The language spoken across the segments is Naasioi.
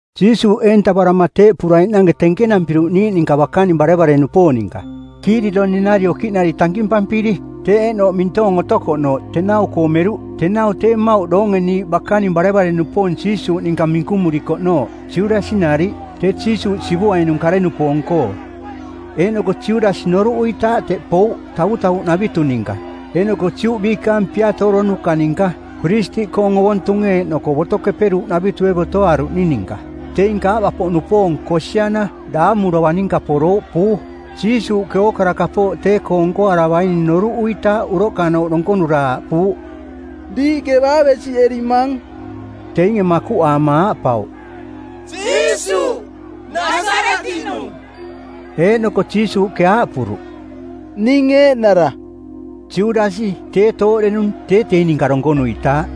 Jiisuuꞌ eentavarama teeꞌpuraiꞌnange tenkenampiruꞌ niiꞌ ninka bakaning barevare-nupoong ninka, Kiidironi-nari okiꞌnari tankimpampiri. Teꞌ eeꞌnooꞌ mintoong otokoꞌnooꞌ; tenau-koo meruꞌ. Tenau tee mmauꞌ doonge niiꞌ bakaning barevare-nupoong Jiisuuꞌninka minkumurikoꞌnooꞌ, Judasi nariꞌ, tee Jiisuuꞌ sivuainung kare-nupoong-koo; Eeꞌnoko Judasi noruꞌuitaaꞌ teꞌ pouꞌ tavutavuꞌnavitu ninka eeꞌnoko Juꞌ biikaang piatooronuka˜ ninka, piristiꞌkoong ovontunge eeꞌnoko Boto Keperuuꞌnavitue botoaaruꞌning ninka. Teing kaava-poꞌnupoong, kosiana, daamu dovang ninka porouꞌ, puu. Jiisuuꞌke ookara kapooꞌ tee-koo nkoaravaining noruꞌuitaaꞌ uroꞌkanooꞌ donkonura aaꞌpuuꞌ, “Diiꞌke baa besiꞌerimang?” Teinge makuꞌaama aaꞌpauꞌ, “Jiisuuꞌ, Nasaretiꞌnung.” Eeꞌnoko Jiisuuꞌke aaꞌpuruꞌ, “Ning eeꞌnara.” Judasi, tee tooꞌdenung, tee teing ninka donkonuitaaꞌ.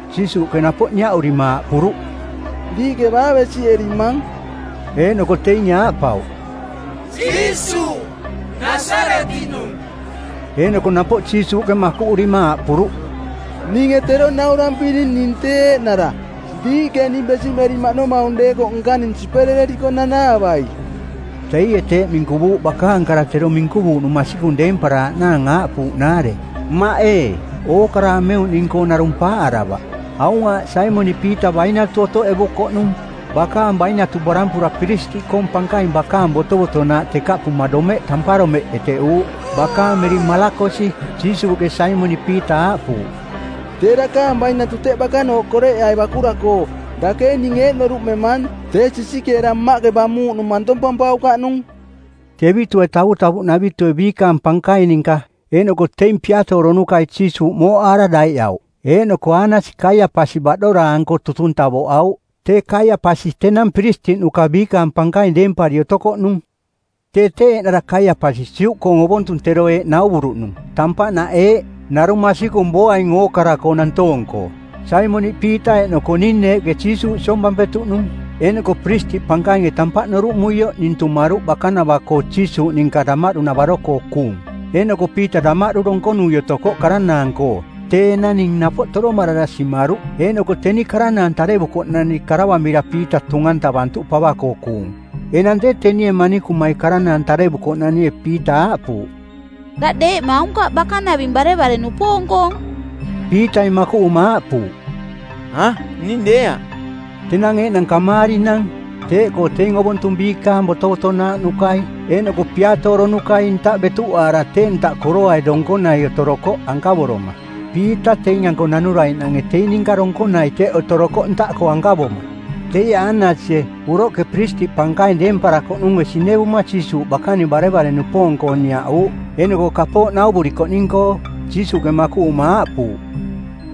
Jiisuuꞌke napoꞌ niaꞌurima aaꞌpuruꞌ, “Diiꞌke baa besiꞌerimang?” Eeꞌnoko teinge aaꞌpauꞌ, “Jiisuuꞌ, Nasaretiꞌnung.” Eeꞌnoko napoꞌ Jiisuuꞌke makuꞌurima aaꞌpuruꞌ, “Ninge tero naurampiring ning tee eeꞌnara. Diiꞌke ning besiꞌmerimaꞌnomaung deekoꞌ nkaning siperereriko nanaavai.” Teie teeꞌ minkuvuuꞌ, bakaang kara tero minkuvuuꞌnung masikung deemparaaꞌnaang aaꞌpuuꞌnaare, “Mmaꞌ ee, ookara ameuꞌning-koo narung paaꞌaravaꞌ.” Aung aaꞌ Saimoniꞌ Piita bainatu otoꞌevukoꞌnung. Bakaang bainatu barampura piristiꞌkoong pankaing bakaang botovotonaaꞌ tekaꞌpuma domeꞌ tamparomeꞌ eteꞌuuꞌ. Bakaang miring Malakosi. Jiisuuꞌke Saimoniꞌ Piita aaꞌpuuꞌ, “Tee dakaang bainatu teꞌ bakanooꞌ koreꞌeai bakura-koo. Dake ee ning eeꞌ noruꞌmemaang, tee sisikeera Mmaꞌke bamuuꞌnung mantompampaukaꞌnung?” Tevitue tavutavuꞌnavitue biikaang pankaing ninka eeꞌnoko teing piatooronukai Jiisuuꞌ mooꞌaara daiꞌauꞌ. Eeꞌnoko Aanasi Kaiapasi baꞌdoraa-anko tutung tavoꞌauꞌ. Tee Kaiapasi tenang piristiꞌnuka biikaang pankaing deempari otokoꞌnung. Tee tee eeꞌnara Kaiapasi Juꞌkoong ovontung tero eeꞌ nauvuruꞌnung, “Tampaꞌnaꞌ eeꞌ: Narung masikung booaing ookara-koo nantoong-koo.” Saimoniꞌ Piita eeꞌnoko ning neeꞌke Jiisuuꞌ siompampetuꞌnung. Eeꞌnoko Piristiꞌ Pankainge tampaꞌ noruꞌmuioꞌ ning tumaruꞌ bakanava-koo Jiisuuꞌ ninka damaꞌdu-navaro-koo kuung. Eeꞌnoko Piita damaꞌdu donkonui otokoꞌ karanaang-koo. Tee enang ning napoꞌ toromarara simaruꞌ. Eeꞌnoko teni karanaang tarevukoꞌnani karavamira Piita tung-antavantuꞌ pava-koo kuung. Enang tee, tenie manikumai karanaang tarevukoꞌnanie Piita aaꞌpuuꞌ, “Daꞌ deeꞌma aunkaꞌ bakaning barevare-nupoong-koong.” Piitai makuꞌuma aaꞌpuuꞌ, “A, ning deeaꞌ.” Tenang eeꞌnang kamaarinang, teeꞌkoo teing ovontung biikaang botovotonaaꞌnukai eeꞌnoko piatooronukai ntaꞌ betuꞌaara tee ntaꞌ koroai donkonai otorokoꞌ ankavoroma. Piita teing-anko nanuraiꞌnange teing ninka donkonai teꞌ otorokoꞌ ntaꞌkoo ankavoma. Teie Aanasie, uroꞌke Piristiꞌ Pankaing deemparakoꞌnunge sinevuma Jiisuuꞌ bakaning barevare-nupoong-koo niaꞌuuꞌ, eeꞌnoko kapooꞌ nauvurikoꞌning-koo. Jiisuuꞌke makuꞌuma aaꞌpuuꞌ,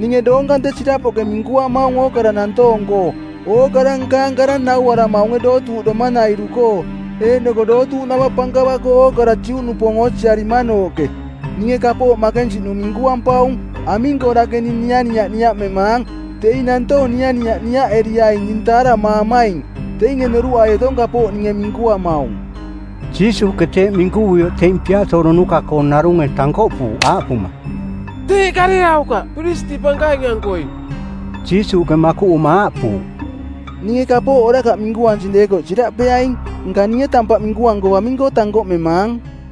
“Ninge doong kante sirapoꞌke minkuamaung ookara nantoong-koo. Ookara nkaang kara nauaramaunge dootuuꞌdoma-nairu-koo eeꞌnoko dootuuꞌnava pankava-koo ookara Juꞌnupoong oosiarimanooꞌke. Ninge kapooꞌ makensiꞌnung minkuampaung. Aming-koo dake ning nianiaꞌ niaꞌmemaang? Teing nantoong nianiaꞌ niaꞌeriaing ning taaramaamaing. Teinge noruꞌai otong kapooꞌ ninge minkuamaung.” Jiisuuꞌke teeꞌ minkuvuioꞌ teing piatooronuka-koong narunge tankoꞌpuuꞌ aaꞌpuma, “Teeꞌ kareaukaꞌ Piristiꞌ Pankaing-ankoi.” Jiisuuꞌke makuꞌuma aaꞌpuuꞌ, “Ninge kapooꞌ orakaꞌ minkuansing deekoꞌ siraꞌpeaing, nka ninge tampaꞌ minkuanko aming-koo tankoꞌmemaang?”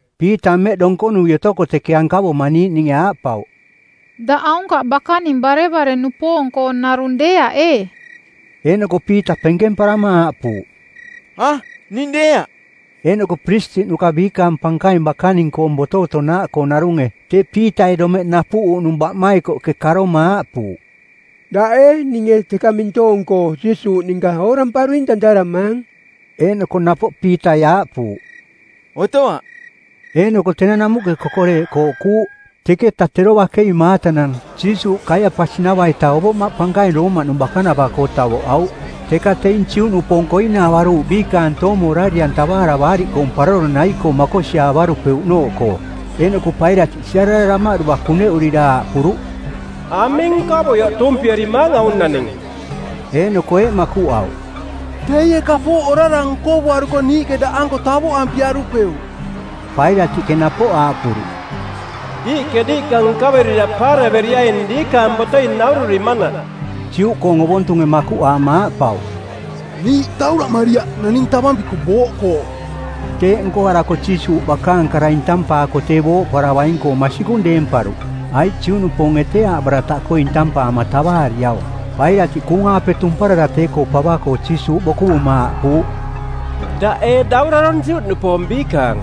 Piita mmeꞌ donkonui otoko teke ankavoma niiꞌninge aaꞌpauꞌ, “Daꞌ aunkaꞌ bakaning barevare-nupoong-koonarung deeaꞌ, ee?” Eeꞌnoko Piita penkemparama aaꞌpuuꞌ, “A, ning deeaꞌ.” Eeꞌnoko piristiꞌnuka biikaang pankaing bakaning-koong botovotonaaꞌkoo narunge, tee Piitai domeꞌ napuꞌuuꞌnung baꞌmaikoꞌke karoma aaꞌpuuꞌ, “Daꞌ ee ninge teka mintoong-koo Jiisuuꞌ ninka ooramparuing tantaramaang?” Eeꞌnoko napoꞌ Piitai aaꞌpuuꞌ, “Otoaꞌ.” Eeꞌnoko tenang namuꞌke kokoreeꞌ kooꞌkuuꞌ. Teketa tero bakei maatanang, Jiisuuꞌ Kaiapasi-nava-ita Ovoꞌmaꞌ Pankaing Roomaꞌnung bakanava-koo tavoꞌauꞌ. Teka teing Juꞌnupoong koinaavaruuꞌ biikaang toomo orari-antavaara Baariꞌkoong Paroro nai-koo makosiaavarupeuꞌnooꞌkoo. Eeꞌnoko Pailatiꞌ siarara damaꞌdua kuneꞌurira aaꞌpuruꞌ, “Aming nkovuioꞌ tuumpierimaang aung naning?” Eeꞌnoko eeꞌ makuꞌauꞌ, “Teie kapooꞌ orara nkovuaruko niiꞌke daꞌanko tavoꞌampiarupeuꞌ.” Pailatiꞌke napoꞌ aaꞌpuruꞌ, “Diiꞌke diiꞌka nkaverira paaraveriaing diikaang botoi naururimanaꞌ.” Juꞌkoong ovontunge makuꞌaama aaꞌpauꞌ, “Niiꞌ tauraꞌmariaꞌ naning tavampiko booꞌkoo.” Teeꞌ nkoarako Jiisuuꞌ bakaang kara intampaako tee booꞌparavaing-koong masikung deemparuꞌ, aiꞌ Juꞌnupoonge tee aaꞌbarataꞌkoo˜ intampaama tavaariaung. Pailatiꞌ kuung-aape tumparara tee-koo pava-koo Jiisuuꞌ bokuvuma aaꞌpuuꞌ, “Daꞌ ee daurarong Juꞌnupoong biikaang?”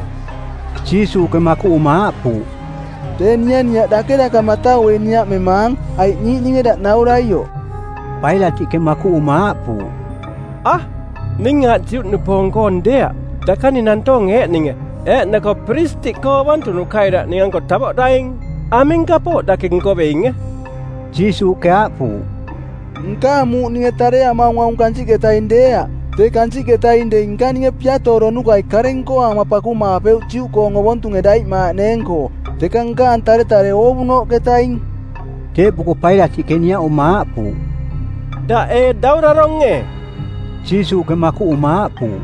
Jiisuuꞌke makuꞌuma aaꞌpuuꞌ, “Tee nianiaꞌ dake daka matauei niaꞌmemaang, aiꞌ niiꞌninge daꞌ nauraioꞌ?” Pailatiꞌke makuꞌuma aaꞌpuuꞌ, “A, ning aaꞌ Juꞌnupoong-koong deeaꞌ. Dakaning nantoonge eeꞌninge eeꞌnoko piristiꞌkoo ovontunukai daꞌ ning-anko tavoꞌdaing. Aming kapooꞌ dake nkoveinge?” Jiisuuꞌke aaꞌpuuꞌ, “Nkaang muuꞌ ninge tareamaung aung kansiꞌketaing deeaꞌ. Tee kansiꞌketaing dei nkaninge piatooronukai kare nkoaama pakumaapeuꞌ Juꞌkoong ovontunge daiꞌmaaꞌneeng-koo. Teka nkaang taretare oovunooꞌketaing.” Teeꞌpuko Pailatiꞌke niaꞌuma aaꞌpuuꞌ, “Daꞌ ee daurarong ee?” Jiisuuꞌke makuꞌuma aaꞌpuuꞌ,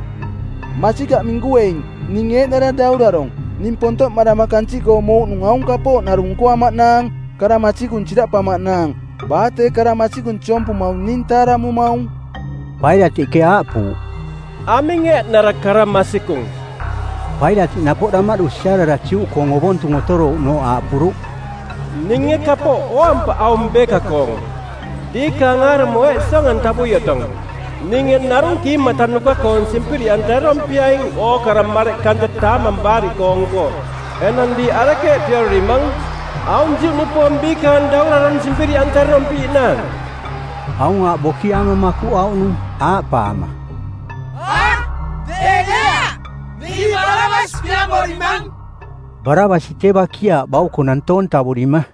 “Masikaꞌ minkueing, ning eeꞌnara daurarong. Ning pontoꞌmarama kansiꞌkoo mouꞌnung aung kapooꞌ narung nkoamaꞌnaang, kara masikung siraꞌpamaꞌnaang. Baa tee kara masikung siompumaung ning taaramumaung.” Pailatiꞌke aaꞌpuuꞌ, “Aming eeꞌnara kara masikung?” Pailatiꞌ napoꞌ damaꞌdu siarara Juꞌkoong ovontung otorouꞌnooꞌ aaꞌpuruꞌ, “Ninge kapooꞌ ooampaꞌ aung beeka-koong. Diikaang aarumo eeꞌ siong-antavui otong: ninge narung kiimatanuka-koong simpiriꞌantarerompiaing ookara mareꞌ kante Taamang Baariꞌkoong-koo. Enang diiꞌ arekeeꞌ piarorimang, aung Juꞌnupoong Biikaang Daurarong simpiriꞌantarerompiiꞌnaang?” Aung aaꞌ bokiaama makuꞌauꞌnung, aaꞌpaama, “A, tee deeaꞌ. Niiꞌ Barabas piamorimang.” Barabasi tee bakiaaꞌ bauko nantoong tavurima.